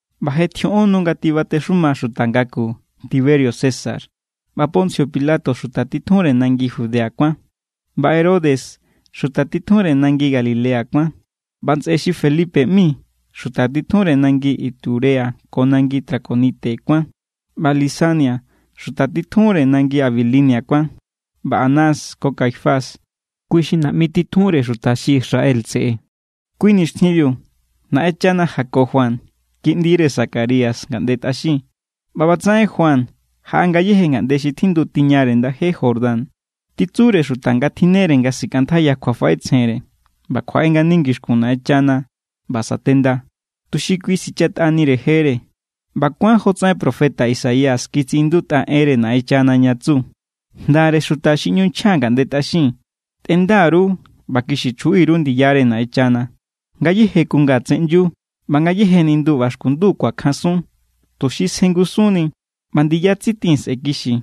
ꞌBa je tjioꞌon nu nga tibatexuma xuta ngaku Tiberio César, ꞌba Poncio Pilato xuta titjunre nangi Judea kuán. ꞌBa Herodes xuta titjunre nangi Galilea kuán, ꞌba ntsꞌe xi Felipe ꞌmi xuta titjunre nangi Iturea ko nangi Traconite kuán, ꞌba Lisania xuta titjunre nangi Abilinia kuán, ꞌba Anás ko Caifás kui xi naꞌmi titjunre xuta xi Israel tseꞌe. Kui nixtjinbiu Naꞌenchana jako Juan, kiꞌndire Zacarías, ngaꞌnde tꞌaxin. ꞌBa ꞌbatsaꞌen Juan jaꞌa ngayéje ngaꞌnde xi tjindu tiñare ndaje Jordán, titsure xuta nga tjinnere nga sikꞌantjaiya kjuafaꞌetsjenre ꞌba kjuaꞌe ngani ngixkun Naꞌenchana ꞌba satenda, tuxi kui sichatꞌanire jere. ꞌBa kuán jotsaꞌen profeta Isaías kitsiꞌindutꞌa enre Naꞌenchana ña tsu: Jndare xuta xi ꞌñu nchja ngaꞌnde tꞌaxin: “Tꞌenda_ru ꞌba kixi chjuꞌi_ru ndiyare Naꞌenchana. Ngayéje kunga tseꞌnyu, ꞌba ngayéje nindu ꞌba xkundu kuakjansun, tuxi sjengusunni. ꞌBa ndiya tsitin sꞌe̱ kixi,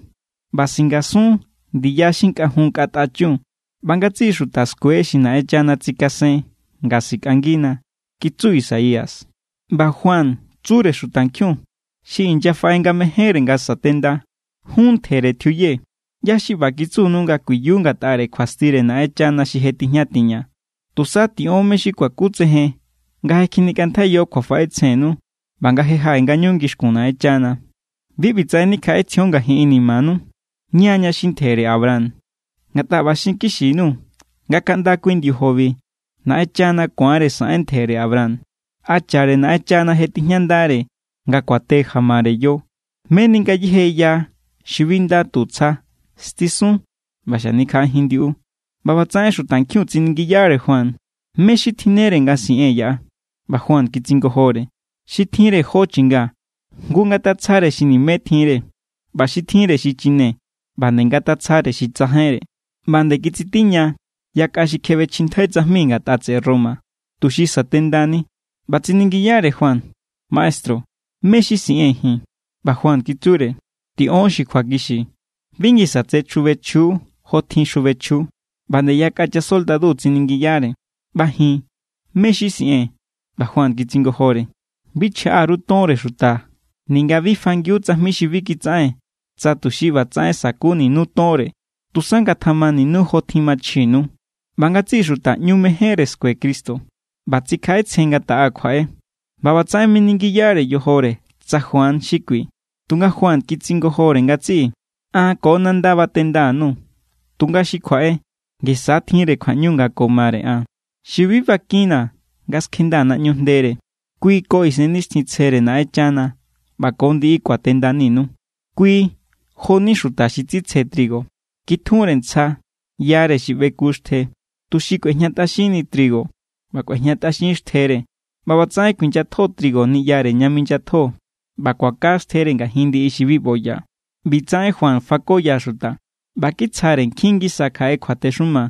ꞌba singasun ndiya xi nkꞌajun nkꞌatꞌa chun. ꞌBa ngatsiꞌi xuta skue xi Naꞌenchana tsikasen nga sikꞌangina” kitsu Isaías. ꞌBa Juan tsure xutankjiun xi inyafaꞌe nga mejénre nga satenda: —¡Jún ntjere tjiuye! ¿ꞌYá= xi ꞌba kitsunu nga kuiyu ngatꞌare kjuastire Naꞌenchana xi je tijña tiña? Tusa tiꞌon mé= xi kuakutsejen nga je kjinikꞌantjaiyo kjuafaꞌetsjennu ꞌba nga je jaꞌe ngañu ngixkun Naꞌenchana. Bi ꞌbitsaꞌen nikjaꞌetsjion ngajin inimanu: “Ña= xi ntjere Abraham.” Ngatꞌa ꞌba xinkixi_nuu̱ nga kaꞌnda kui ndiojobi Naꞌenchana ku̱anre saꞌen ntjere Abraham. Hachare Naꞌenchana je tijñandare nga kuate jamare yo. Meni ngayéje ya xi bi nda tu tsja, stisun ꞌba xanikjaꞌajin ndiꞌu. ꞌBa ꞌbatsaꞌen xutankjiun tsiningiyare Juan: —¿Mé= xi tjinnere nga siꞌee̱n yaꞌa? ꞌBa Juan kitsingojore: —Xi tjinre jó chinga, jngu ngatatsjare xi nimé tjinre. ꞌBa xi tjinre xichine, ꞌba nde ngatatsjare xi tsajainre. ꞌBa nde kitsitiña yakꞌa xi kjebechjintjai tsajmi ngatꞌa tseꞌe Roma, tuxi satendani, ꞌba tsiningiyare Juan: —Maestru, ¿mé= xi siꞌee̱n ji̱n? ꞌBa Juan kitsure: —Tiꞌon xi kjuakixi. Bi ngisa tse chjubechjiu jotjin xjubechjiu. ꞌBa nde yakꞌa chasoldadu tsiningiyare: —ꞌBa ji̱n, ¿mé= xi siꞌee̱n? ꞌBa Juan kitsingojore: —Bi chjaꞌa_ru tonre xuta ninga bi fangiu tsajmi xi bi kitsaꞌen tsa tuxi ꞌbatsaꞌen sa̱kuninu tonre; tusa ngatjamaninu jotjin machjinu. ꞌBa ngatsiꞌi xuta ꞌñu mejénre skue Cristo ꞌba tsikjaꞌetsjen nga taꞌa kjuaꞌe, ꞌba ꞌbatsaꞌen miningiyare yojore tsa Juan xi kui. Tunga Juan kitsingojore ngatsiꞌi: —An ko nanda batenda_nuu̱, tunga xi kjuaꞌe, ngisa tjinre kjuaꞌñu nga ko mare an, xi bi bakinna̱ nga skjendaa̱ naꞌñu jndere. Kui ko Isennixtjintsjere Naꞌenchana ꞌba ko ndiꞌi kuatendaninu. Kui jo=ni xuta xi tsitsje trigo. Kitjunre ntsja yare xi ꞌbeku xtje, tuxi kꞌuejñatꞌaxinni trigo ꞌba kꞌuejñatꞌaxin xtjere. ꞌBa ꞌbatsaꞌen kuinyatjo trigo niꞌyare ña minyatjo, ꞌba kuaka xtjere ngajin ndiꞌi xi bi ꞌboya. ꞌBi tsaꞌen Juan fakoya xuta ꞌba kitsjare nkjin ngisa kjaꞌe kjuatexuma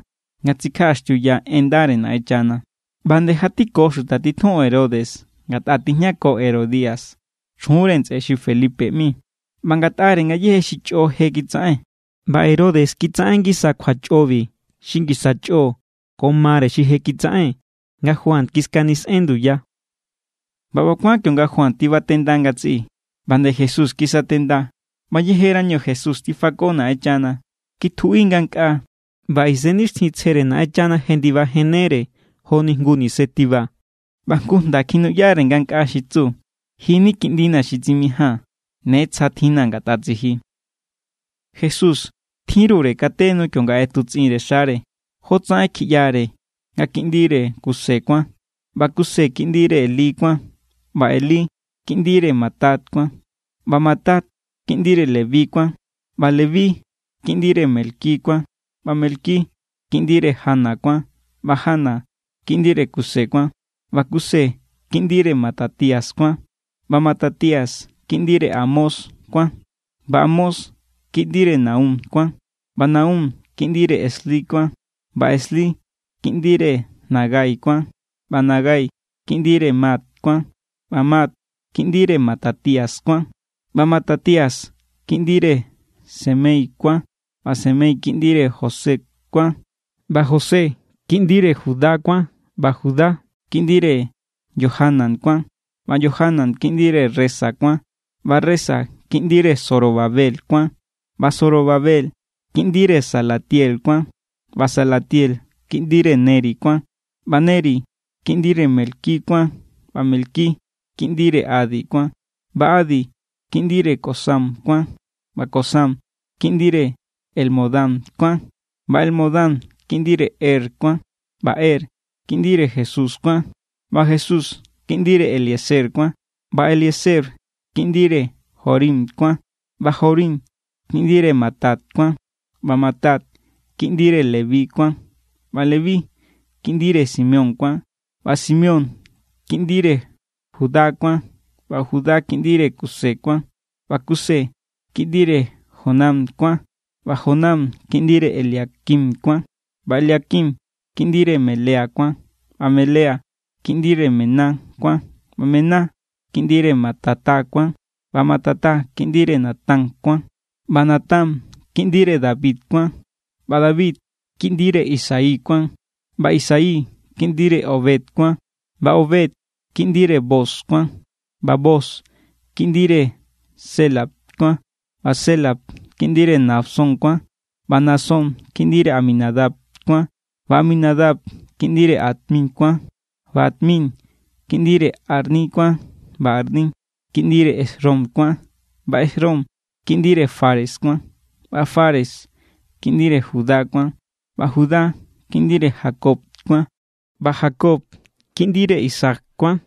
nga tsikjaꞌaxtiuya en ndare Naꞌenchana. ꞌBa nde jatiko xuta titjun Herodes ngatꞌa tijñako Herodia, chjunre ntsꞌe xi Felipe ꞌmi, ꞌba ngatꞌare ngayéje xi chꞌo xi je kitsaꞌen. ꞌBa Herodes kitsaꞌen ngisa kjuachꞌobi xi ngisa chꞌo nga ko mare xi je kitsaꞌen nga Juan kiskanisꞌen nduya. ꞌBa ꞌba kuán kionga Juan tibatenda ngatsiꞌi, ꞌba nde Jesús kisatenda. ꞌBa yejerañu Jesús tifako Naꞌenchana, kitjuꞌi ngankꞌaa. ꞌBa Isennixtjintsjere Naꞌenchana jendibajennere joni jngu nise tiba. ꞌBa jngu jnda kjinuꞌyanire ngankꞌaa xi tsu: —Ji ni kiꞌndina̱ xi tsimijaa̱n. Ne tsja tjinna̱ ngatꞌa tsiji. Jesús tjinrure kate nu kionga ꞌetutsꞌinre xare. Jotsaꞌen kjiꞌyare nga kiꞌndire Kuse kuán. ꞌBa Kuse kiꞌndire Elí kuán. ꞌBa Elí kiꞌndire Matat kuán. ꞌBa Matat kiꞌndire Leví kuán. ꞌBa Leví kiꞌndire Melqui kuán. ꞌBa Melqui kiꞌndire Jana kuán. ꞌBa Jana kiꞌndire Kuse kuán. ꞌBa Kuse kiꞌndire Matatías kuán. ꞌBa Matatías kiꞌndire Amós kuán. ꞌBa Amós kiꞌndire Nahum kuán. ꞌBa Nahum kiꞌndire Esli kuán. ꞌBa Esli kiꞌndire Nagai kuán. ꞌBa Nagai kiꞌndire Maat kuán. ꞌBa Maat kiꞌndire Matatías kuán. ꞌBa Matatías kiꞌndire Semei kuán. ꞌBa Semei kiꞌndire José kuán. ꞌBa José kiꞌndire Judá kuán. ꞌBa Judá kiꞌndire Johanán kuán. ꞌBa Johanán kiꞌndire Resa kuán. ꞌBa Resa kiꞌndire Zorobabel kuán. ꞌBa Zorobabel kiꞌndire Salatiel kuán. ꞌBa Salatiel kiꞌndire Neri kuán. ꞌBa Neri kiꞌndire Melqui kuán. ꞌBa Melqui kiꞌndire Adi kuán. ꞌBa Adi kiꞌndire Cosam kuán. ꞌBa Cosam kiꞌndire Elmodam kuán. ꞌBa Elmodam kiꞌndire Er kuán. ꞌBa Er kiꞌndire Jesús kuán. ꞌBa Jesús kiꞌndire Eliezer kuán. ꞌBa Eliezer kiꞌndire Jorim kuán. ꞌBa Jorim kiꞌndire Matat kuán. ꞌBa Matat kiꞌndire Leví kuán. ꞌBa Leví kiꞌndire Simeón kuán. ꞌBa Simeón kiꞌndire Judá kuán. ꞌBa Judá kiꞌndire Kuse kuán. ꞌBa Kuse kiꞌndire Jonán kuán. ꞌBa Jonán kiꞌndire Eliaquim kuán. ꞌBa Eliaquim kiꞌndire Melea kuán. ꞌBa Melea kiꞌndire Mainán kuán. ꞌBa Mainán kiꞌndire Matata kuán. ꞌBa Matata kiꞌndire Natán kuán. ꞌBa Natán kiꞌndire David kuán. ꞌBa David kiꞌndire Isaí kuán. ꞌBa Isaí kiꞌndire Obed kuán. ꞌBa Obed kiꞌndire Booz kuán. ꞌBa Booz kiꞌndire Sélah kuán. ꞌBa Sélah kiꞌndire Nahasón kuán. ꞌBa Nahasón kiꞌndire Aminadab kuán. ꞌBa Aminadab kiꞌndire Admín kuán. ꞌBa Admín kiꞌndire Arní kuán. ꞌBa Arní kiꞌndire Hesrón kuán. ꞌBa Hesrón kiꞌndire Fares kuán. ꞌBa Fares kiꞌndire Judá kuán. ꞌBa Judá kiꞌndire Jacob kuán. ꞌBa Jacob kiꞌndire Isaac kuán.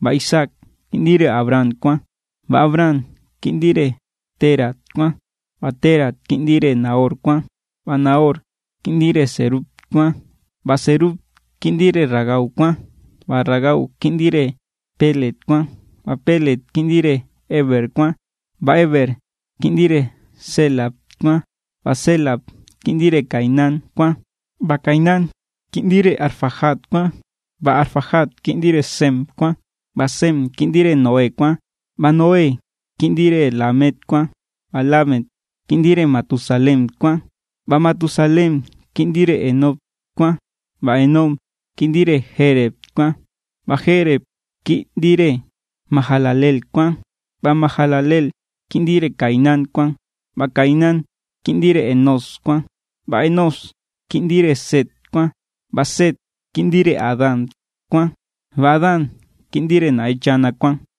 ꞌBa Isaac kiꞌndire Abraham kuán. ꞌBa Abraham kiꞌndire Térah kuán. ꞌBa Térah kiꞌndire Nahor kuán. ꞌBa Nahor kiꞌndire Serug kuán. ꞌBa Serug kiꞌndire Ragau kuán. ꞌBa Ragau kiꞌndire Péleg kuán. ꞌBa Péleg kiꞌndire Éber kuán. ꞌBa Éber kiꞌndire Sélah kuán. ꞌBa Sélah kiꞌndire Cainán kuán. ꞌBa Cainán kiꞌndire Arfaxad kuán. ꞌBa Arfaxad kiꞌndire Sem kuán. ꞌBa Sem kiꞌndire Noé kuán. ꞌBa Noé kiꞌndire Lámec kuán. ꞌBa Lámec kiꞌndire Matusalén kuán. ꞌBa Matusalén kiꞌndire Henoc kuán. ꞌBa Henoc kiꞌndire Jéred kuán. ꞌBa Jéred kiꞌndire Mahalaleel kuán. ꞌBa Mahalaleel kiꞌndire Cainán kuán. ꞌBa Cainán kiꞌndire Enós kuán. ꞌBa Enós kiꞌndire Set kuán. ꞌBa Set kiꞌndire Adán kuán. ꞌBa Adán kiꞌndire Naꞌenchana kuán.